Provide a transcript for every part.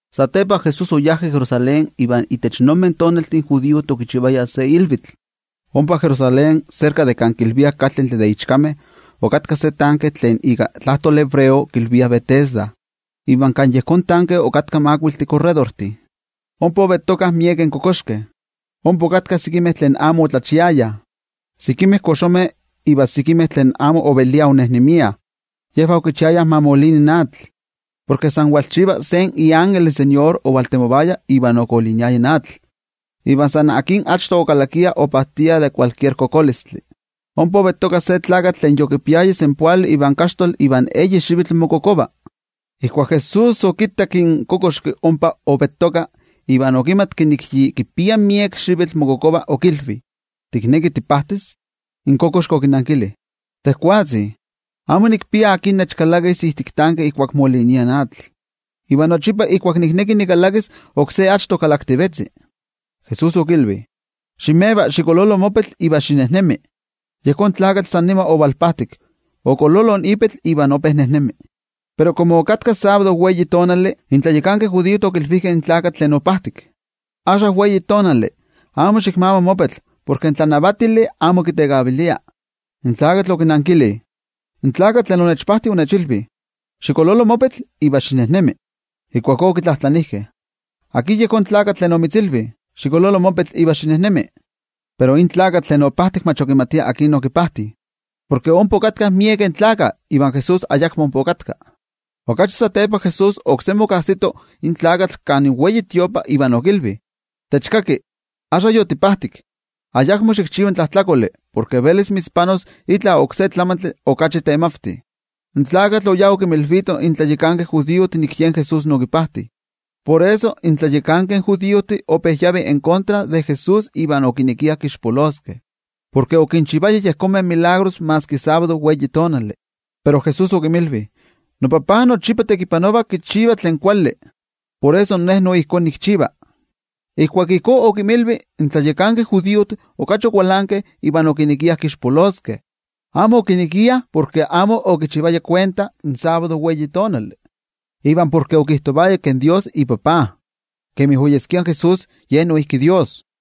Satepa, Jesús oyá Jerusalén iva itech yejonmeh tonaltih in judiojtih okichivayah se ilvitl. Ompa Jerusalén, serka de kan kilviah kaltentli de ichkameh, okatka se tanke tlen ika tlajtoli hebreo kilviah Betesda, iva kan yejón tanke okatkah makuiltih korredortih. Ompa ovettokah miekeh kokoxkeh. Ompa okatkah sekimeh tlen amo otlachiayah, sekimeh koxomeh iva sekimeh tlen amo oveliah onejnemiah, yejvah okichiayah ma molini in atl. Porke san kivalchiva se ilvikaktlatitlanili ovaltemovaya iva okoliniaya in atl, iva san akin achto okalakia, opajtia de san tlan kokolistli. Ompa ovettoka se tlakatl tlen yokipiaya senpoali ivan kaxtoli ivan eyi xivitl mokokova. Ijkuak Jesús okittak in kokoxki ompa ovettoka iva okimatki nik yi kipia miek xivitl mokokova, okilvi: —¿Tikneki tipajtis? In kokoxki okinankili: —Tejwatzi, amo nikpia akin nechkalakis ijtik tanke ijkuak molinia in atl. Iva nochipa ijkuak nikneki nikalakis, oksé achto kalaktivetzi. Jesús okilvi: —Ximeva, xikololo mopetl iva xinejnemi. Yejón tlakatl san nima ovalpajtik, okololo ipetl iva ope nejnemi. Pero komo okatka sábado, in tlayakankeh judiojtih okilvijkeh in tlakatl tlen opajtik: —Axka sábado, amo xikmama mopetl porke in tlanavatili amo kitekavilia. In tlakatl okinnankili: —In tlakatl tlen onechpajti onechilvi: “Xikololo mopetl iva xinejnemi.” Ijkuakó okitlajtlanijkeh: —¿Akin yejón tlakatl tlen omitzilvi: “Xikololo mopetl iva xinejnemi”? Pero in tlakatl tlen opajtik amo okimatia akin okipajti, porke ompa okatkah miekeh gentejtih iva Jesús ayakmo ompa okatka. Okachi satepa Jesús oksemi okajsito in tlakatl kan templo iva okilvi: —Techkaki, axka yotipajtik, ayakmo xikchiva tlajtlakoli, porke velis mitzpanos itla oksé tlamantli okachi temavti. In tlakatl oyá okinmilvito in tlayakankeh judiojtih nik yen Jesús okipajti. Por eso, in tlayakankeh judiojtih san tlen amo ope kitoktiah in Jesús iva okinekiah kixpoloskeh, porke okinchivaya tetzavimeh maski sábado. Pero Jesús okinmilvi: —NoTajtzi nochipa tekipanova kichiva tlen kuali, por eso Ne noijki ijkó nikchiva. Ijkuak ijkó okinmilvi, in tlayakankeh judiojtih okachi okualankeh iva okinekiah kixpoloskeh. Amo okinekiah porke amo okitlakitaya in sábado, iva porke okijtovaya ke in Dios yen iTajtzi, iva por eso Ye noijki Dios.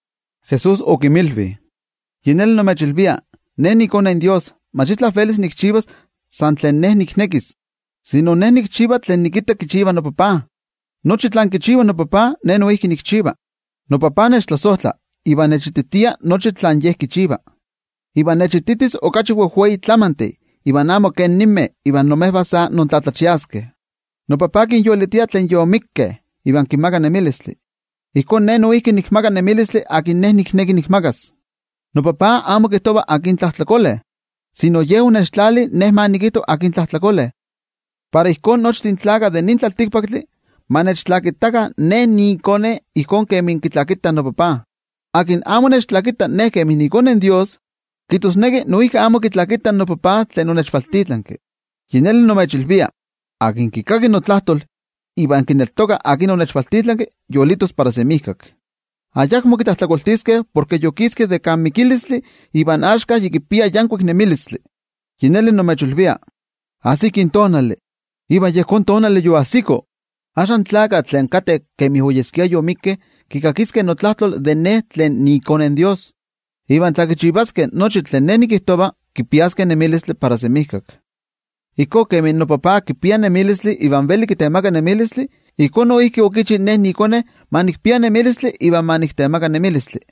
Jesús okinmilvi: —Yi neli nimechilvia: iKone in Dios, mach itla velis kichivas san tlen Ye kinekis, sino Ye kichiva tlen kitta kichiva iTajtzi. Nochi tlen kichiva iTajtzi Ye noijki ijkó kichiva. ITajtzi kitlasojtla iva kititia nochi tlen Ye kichiva, iva kititis okachi wejwei tlamantih iva amo kemi ninmeh iva imejvah sa intlatlachiaskeh. Ijkó kemi iTajtzi kinyolitia tlen yomikkeh iva kinmaka nemilistli, ijkó noijki iKone kinmaka nemilistli tlen Ye kineki kinmakas. ITajtzi amo kijtova akin tlajtlakole, sino Ye okitlali iKone yen ma kijto akin tlajtlakole, para ijkó nochtin tlaltikpaktlakah ma kitlakitakah iKone ijkó kemi kitlakitah iTajtzi. Tlen amo kitlakita iKone in Dios, kijtosneki noijki amo kitlakita in iTajtzi tlen okivaltitlanki. ’Yi neli nimechilvia: Tlen kikaki notlajtol iva kineltoka tlen onechvaltitlanki, yolitos para semijkak. Ayakmo kitlajtlakoltiskeh, porke yokiski de kan mikilistli iva axka yi kipia yankuik nemilistli. Yi neli nimechilvia, ajsiki tonali, iva yejón tonali yoajsiko. Axka, tlen kateh kemi oyeskia yomikkeh kikakiskeh itlajtol iKone in Dios, iva tla kichivaskeh tlen kijtova, kipiaskeh nemilistli para semijkak. Ijkó kemi iTajtzi kipia nemilistli iva veli kitemaka nemilistli, ijkó noijki okichi ke iKone ma kipia nemilistli iva ma kitemaka nemilistli.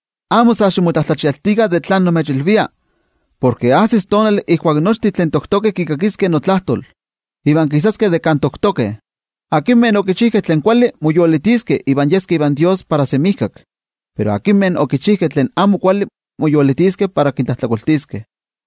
Amo sa ximotlatlachialtikah de tlen nimechilvia, porke ajsis tonali ijkuak nochtin tlen toktokeh kikakiskeh itlajtol, iva kisaskeh de kan toktokeh. Tlen okichijkeh tlen kuali, moyolitiskeh iva yeskeh ivan Dios para semijkak. Pero tlen okichijkeh tlen amo kuali, moyolitiskeh para kintlajtlakoltiskeh.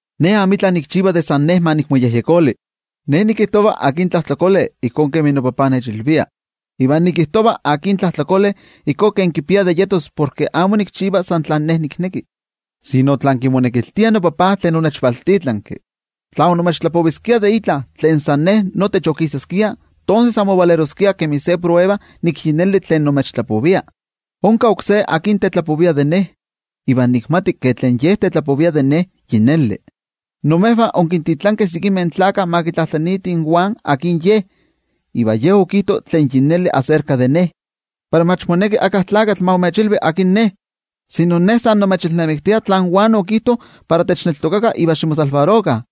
’Ne amitla nikchiva tlen san Ne ma nikmoyejyekoli. Ne nikijtova akin tlajtlakole ijkó kemi noTajtzi nechilvia. Iva nikijtova akin tlajtlakole ijkó kemi kipia de yetos porke amo nikchiva san tlen Ne nikneki, sino tlen kimonekiltia noTajtzi tlen onechvaltitlanki. Tla onimechtlapoviskia de itla, tlen san Ne notech onikixtiskia, tonses amo ovaleroskia kemi se prueba nik yi neli tlen nimechtlapovia. Onka oksé akin tetlapovia de Ne, iva nikmati ke tlen Ye tetlapovia de Ne, yi neli. Imejvah onkintitlankeh sekimeh tlakah ma kitlajtlaniitih in Juan akin ye, iva ye okijto tlen yi neli aserka de Ne. Pero mach moneki íkka tlakatl ma imechilvi akin Ne, sino Ne san nimechilnamiktia tlen Juan okijto para techneltokakah iva ximomakixtikah.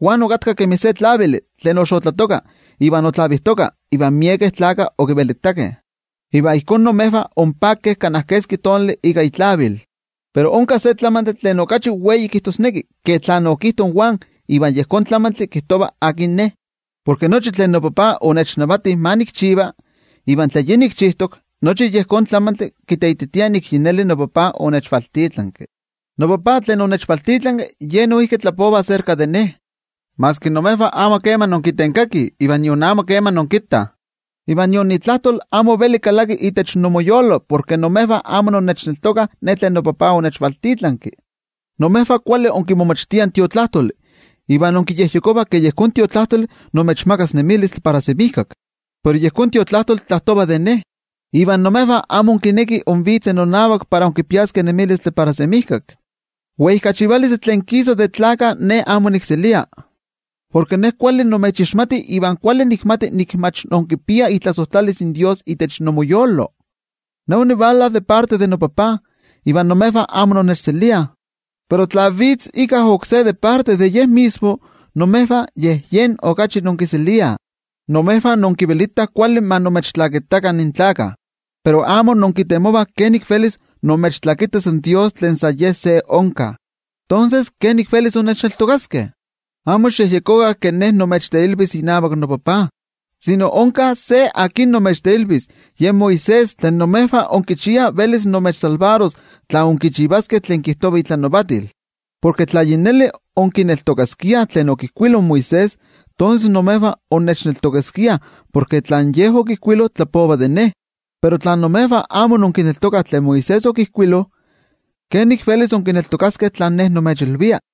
Juan okatka kemi se tlavili tlen oxotlatoka iva otlavijtoka, iva imejvah onpakeh kana keski tonali ika itlavil. Pero onka se tlamantli tlen okachi weititok ke tlen okijto in Juan iva yejón tlamantli kijtova akin Ne. Porke nochi tlen noTajtzi onechnavati ma nikchiva, iva tlen yi nikchijtok, nochi yejón tlamantli kiteititia nik yi neli noTajtzi onechvaltitlanki. NoTajtzi tlen onechvaltitlanki Ye noijki tlapova aserka de Ne, maski imejvah amo kema inkitenkakih ivan nion amo kema inkittah, iva nion itlajtol amo veli kalaki itech inmoyolo porke imejvah amo inkineltokah tlen Ye okivaltitlanki. Imejvah kuali inkimomachtiah in Tiotlajkuiloli, iva inkiyejyekovah ke yejón Tiotlajkuiloli imechmakas nemilistli para semijkak. Pero yejón Tiotlajkuiloli tlajtova de Ne, iva imejvah amo inkinekih invitzeh nonavak para inkipiaskeh nemilistli para semijkak. ’Weijkachivalistli tlen kisa de tlaltikpaktlakah Ne amo nikselia. Porke Ne kuali nimechixmati iva kuali nikmati nik mach inkipiah itlasojtlalis in Dios itech inmoyolo. Ne onivala ika itoka noTajtzi, iva imejvah amo innechseliah. Pero tla vitz íkka oksé ika ye itoka, imejvah yej yen okachi inkiseliah. Imejvah inkivelitah kuali ma imechtlakitakah in tlaltikpaktlakah, pero amo inkitemovah kenik velis imechtlakitas in Dios tlen san Ye se onka. Tonses, ¿kenik velis innechneltokaskeh? Amo xikyejyekokah ke Ne nimechteilvis inavak noTajtzi, sino onka se akin imechteilvis, yen Moisés, porke imejvah inmotenmachiah itech tlen Moisés okijkuilo. Porke tla yi neli onkineltokaskiah tlen okijkuilo in Moisés, tonses imejvah onnechneltokaskiah, porke tlen ye okijkuilo tlapova de Ne. Pero tla imejvah amo inkineltokah tlen Moisés okijkuilo, ¿kenik velis inkineltokaskeh tlen Ne nimechilvia?